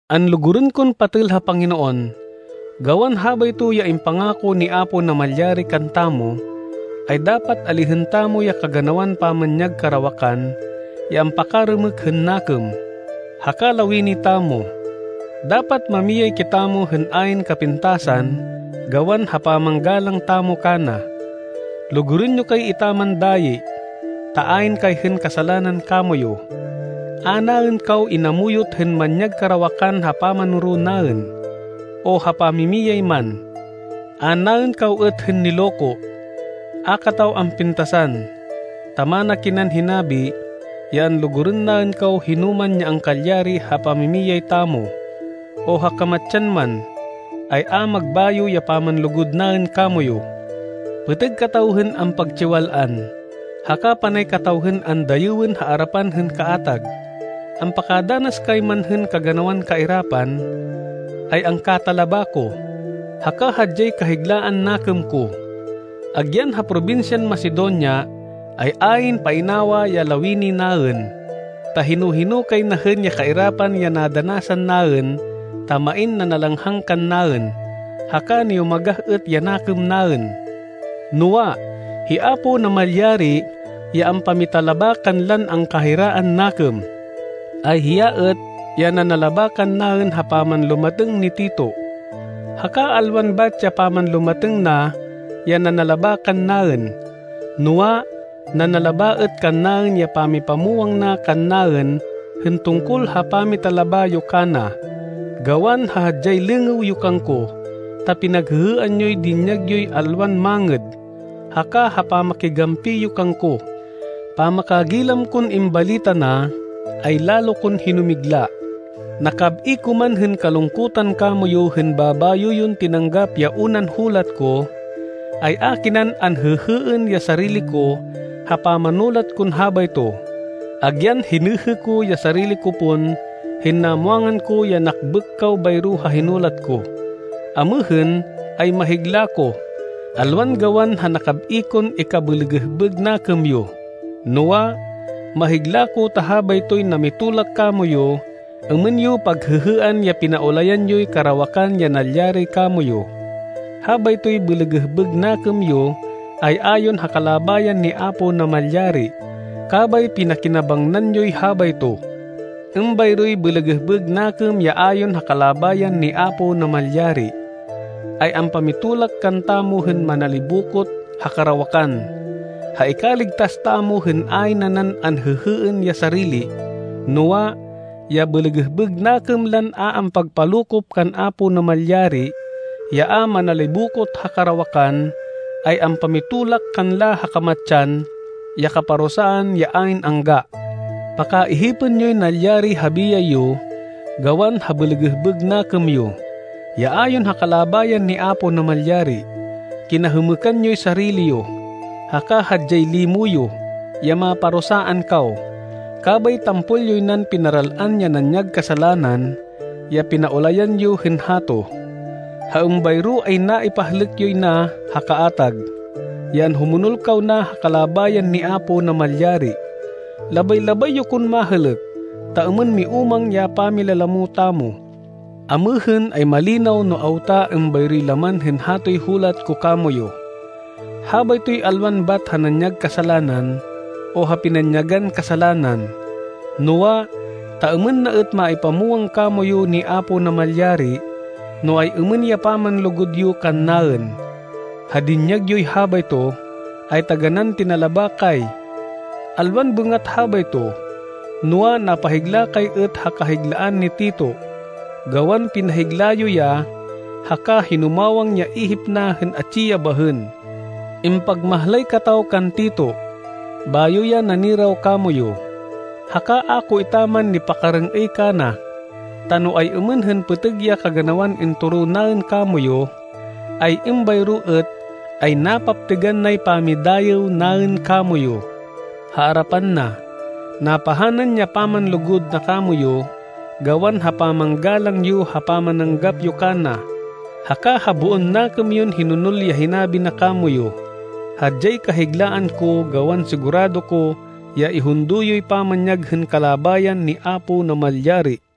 Anlugurên kon patêl ha Panginoon, gawan habayto ya impangako ni Apo Namalyari kantamo, ay dapat alihên tamo ya kaganawan pamanyag karawakan ya ampakarêmêk hên nakêm, haka lawini tamo. Dapat mamiyay kitamo hên ayn kapintasan gawan ha pamanggalang tamo kana. Lugurên yo kay etaman dayi, ta ayn kay hên kasalanan kamoyu. A naên kaw inamuyot hên manyag karawakan ha pamanoro naên, o ha pamimiyay man. A naên kaw êt hên niloko. A kataw ampintasan, ta mana kinan hinabi, ya anlugurên naên kaw hinoman ya angkalyari ha pamimiyay tamo, o ha kamatsan man, ay a magbayo ya pamanlugud naên kamoyu. Pêtêg kataw hên ampagtsiwal-an, haka panay kataw hên andayêwên ha arapan hên kaatag. Ampakadanas kay man hên kaganawan kairapan, ay angkatalaba ko, haka hadyay kahiglaan nakêm ko. Agyan ha probinsyan Macedonia, ay ayn painawa ya lawini naên, ta hino-hino kay na hên ya kairapan ya nadanasan naên ta main nanalanghang kannaên, haka niyumagah êt ya nakêm naên. Noa, hi Apo Namalyari ya ampamitalaba kanlan angkahiraan nakêm, ay hiya êt, ya nanalaba kannaên ha pamanlumatêng ni Tito. Haka alwan bat ya pamanlumatêng na ya nanalaba kannaên, noa, nanalaba êt kannaên ya pamipamwang na kannaên hên tungkol ha pamitalaba yo kana, gawan ha hadyay lêngêw yo kangko, ta pinaghêhêan yoy dinyag yoy alwan mangêd, haka ha pamakigampi yo kangko. Pamakagilam kon imbalita na, ay lalo kon hinumigla. Nakab-i ko man hên kalungkutan kamoyu hên babayo yon tinanggap ya unan hulat ko, ay a kinan anhêhêên ya sarili ko ha pamanulat kon habayto, agyan hinêhê ko ya sarili ko pon hên namwangan ko ya nakbêk kaw bayro ha hinulat ko. Amêhên ay mahigla ko, alwan gawan ha nakab-i kon ikabêlêgêhbêg nakêm yo, noa, mahigla ko ta habaytoy namitolak kamoyu êmên yo paghêhêan ya pinaulayan yoy karawakan ya nalyari kamoyu. Habaytoy bêlêgêhbêg nakêm yo ay ayon ha kalabayan ni Apo Namalyari, kabay pinakinabangnan yoy habayto. Êmbayroy bêlêgêhbêg nakêm ya ayon ha kalabayan ni Apo Namalyari, ay ampamitolak kantamo hên manalibokot ha karawakan, ha ikaligtas tamo hên ayn nanan anhêhêên ya sarili. Noa, ya bêlêgêhbêg nakêm lan a ampagpalokop kan Apo Namalyari, ya a manalibokot ha karawakan, ay ampamitolak kanla ha kamatsan, ya kaparusaan ya ayn angga. Pakaihipên yoy nalyari ha biyay yo gawan ha bêlêgêhbêg nakêm yo, ya ayon ha kalabayan ni Apo Namalyari! Kinahêmêkan yoy sarili yo, haka hadyay limo yo, ya maparusaan kaw, kabay tampol yoy nan pinaral-an ya nanyag kasalanan ya pinaulayan yo hên hato. Ha êmbayro ay naipahlêk yoy na ha kaatag, ya anhumonol kaw na ha kalabayan ni Apo Namalyari. Labay-labay yo kon mahêlêk, ta êmên miúmang ya pamilalamo tamo. Amêhên ay malinaw no awta êmbayroy laman hên hatoy hulat ko kamoyu. Habaytoy alwan bat ha nanyag kasalanan o ha pinanyagan kasalanan, noa, ta êmên na êt maipamwang kamoyu ni Apo Namalyari, no ay-êmên ya pamanlugud yo kannaên. Ha dinyag yoy habayto, ay taganán tinalaba kay. Alwan bêngat habayto, noa, napahigla kay êt ha kahiglaan ni Tito, gawan pinahigla yo ya haka hinumawang ya ihip na hên atsi ya bahên. Impagmahlay kataw kan Tito, bayo ya naniraw kamoyu, haka a ko etaman nipakarêng-êy kana, ta no ay-êmên hên pêtêg ya kaganawan intoro naên kamoyu, ay êmbayro êt, ay napaptêgan nay pamidayêw naên kamoyu, ha arapan na. Napahanan ya pamanlugud na kamoyu gawan ha pamanggalang yo ha pamananggap yo kana, haka ha boon nakêm yon hinonol ya hinabi na kamoyu. Hadyay kahiglaan ko gawan sigurado ko ya ihundo yoy pamanyag hên kalabayan ni Apo Namalyari.